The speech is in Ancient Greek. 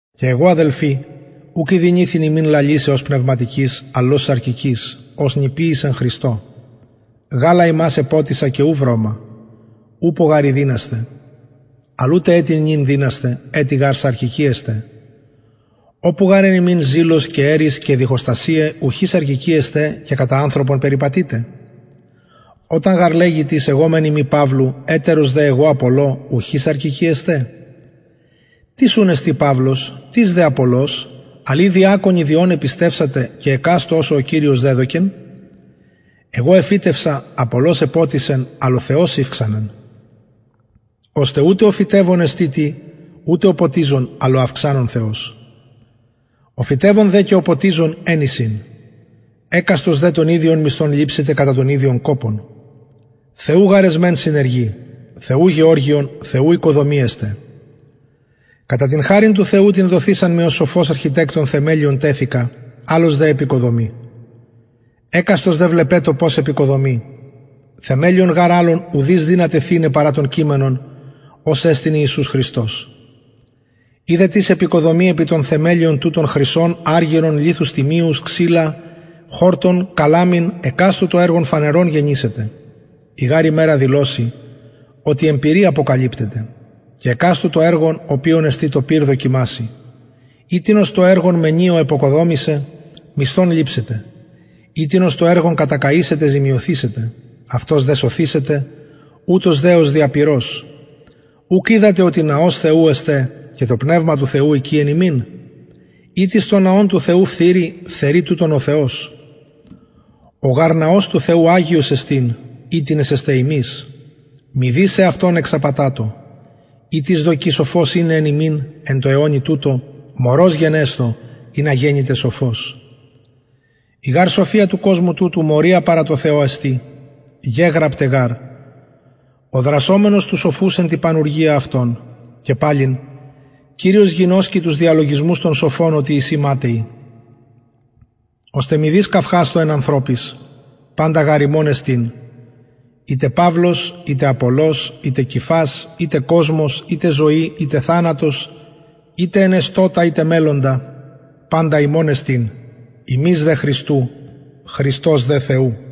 και εγω αδελφοι ουκ ηδυνηθην υμιν λαλησαι ως πνευματικοις αλλ ως σαρκικοις ως νηπιοις εν χριστω γαλα υμας εποτισα και ου βρωμα ουπω γαρ εδυνασθε αλλ ουτε ετι νυν δυνασθε ετι γαρ σαρκικοι εστε οπου γαρ εν υμιν ζηλος και ερις και διχοστασιαι ουχι σαρκικοι εστε και κατα ανθρωπον περιπατειτε οταν γαρ λεγη τις εγω μεν ειμι παυλου ετερος δε εγω απολλω ουχι σαρκικοι εστε τις ουν εστιν παυλος τις δε απολλως αλλ η διακονοι δι ων επιστευσατε και εκαστω ως ο κυριος εδωκεν εγω εφυτευσα απολλως εποτισεν αλλ ο θεος ηυξανεν ωστε ουτε ο φυτευων εστιν τι ουτε ο ποτιζων αλλ ο αυξανων θεος ο φυτευων δε και ο ποτιζων εν εισιν εκαστος δε τον ιδιον μισθον ληψεται κατα τον ιδιον κοπον θεου γαρ εσμεν συνεργοι θεου γεωργιον θεου οικοδομη εστε κατα την χαριν του θεου την δοθεισαν μοι ως σοφος αρχιτεκτων θεμελιον τεθεικα αλλος δε εποικοδομει εκαστος δε βλεπετω πως εποικοδομει θεμελιον γαρ αλλον ουδεις δυναται θειναι παρα τον κειμενον ος εστιν ιησους χριστος ει δε τις εποικοδομει επι τον θεμελιον τουτον χρυσον αργυρον λιθους τιμιους ξυλα χορτον καλαμην εκαστου το εργον φανερον γενησεται η γαρ ημερα δηλωσει οτι εν πυρι αποκαλυπτεται και εκαστου το εργον οποιον εστιν το πυρ δοκιμασει ει τινος το εργον μενει ο εποικοδομησεν μισθον ληψεται ει τινος το εργον κατακαησεται ζημιωθησεται αυτος δε σωθησεται ουτως δε ως δια πυρος ουκ οιδατε οτι ναος θεου εστε και το πνευμα του θεου οικει εν υμιν ει τις τον ναον του θεου φθειρει φθερει τουτον ο θεος ο γαρ ναος του θεου αγιος εστιν οιτινες εστε υμεις μηδεις εαυτον εξαπατατω ει τις δοκει σοφος ειναι εν υμιν εν τω αιωνι τουτω μωρος γενεσθω ινα γενηται σοφος η γαρ σοφια του κοσμου τουτου μωρια παρα τω θεω εστιν γεγραπται γαρ ο δρασσομενος τους σοφους εν τη πανουργια αυτων και παλιν κυριος γινωσκει τους διαλογισμους των σοφων οτι εισιν ματαιοι ωστε μηδεις καυχασθω εν ανθρωποις παντα γαρ υμων εστιν ειτε παυλος ειτε απολλως ειτε κηφας ειτε κοσμος ειτε ζωη ειτε θανατος ειτε ενεστωτα ειτε μελλοντα παντα υμων εστιν υμεις δε χριστου χριστος δε θεου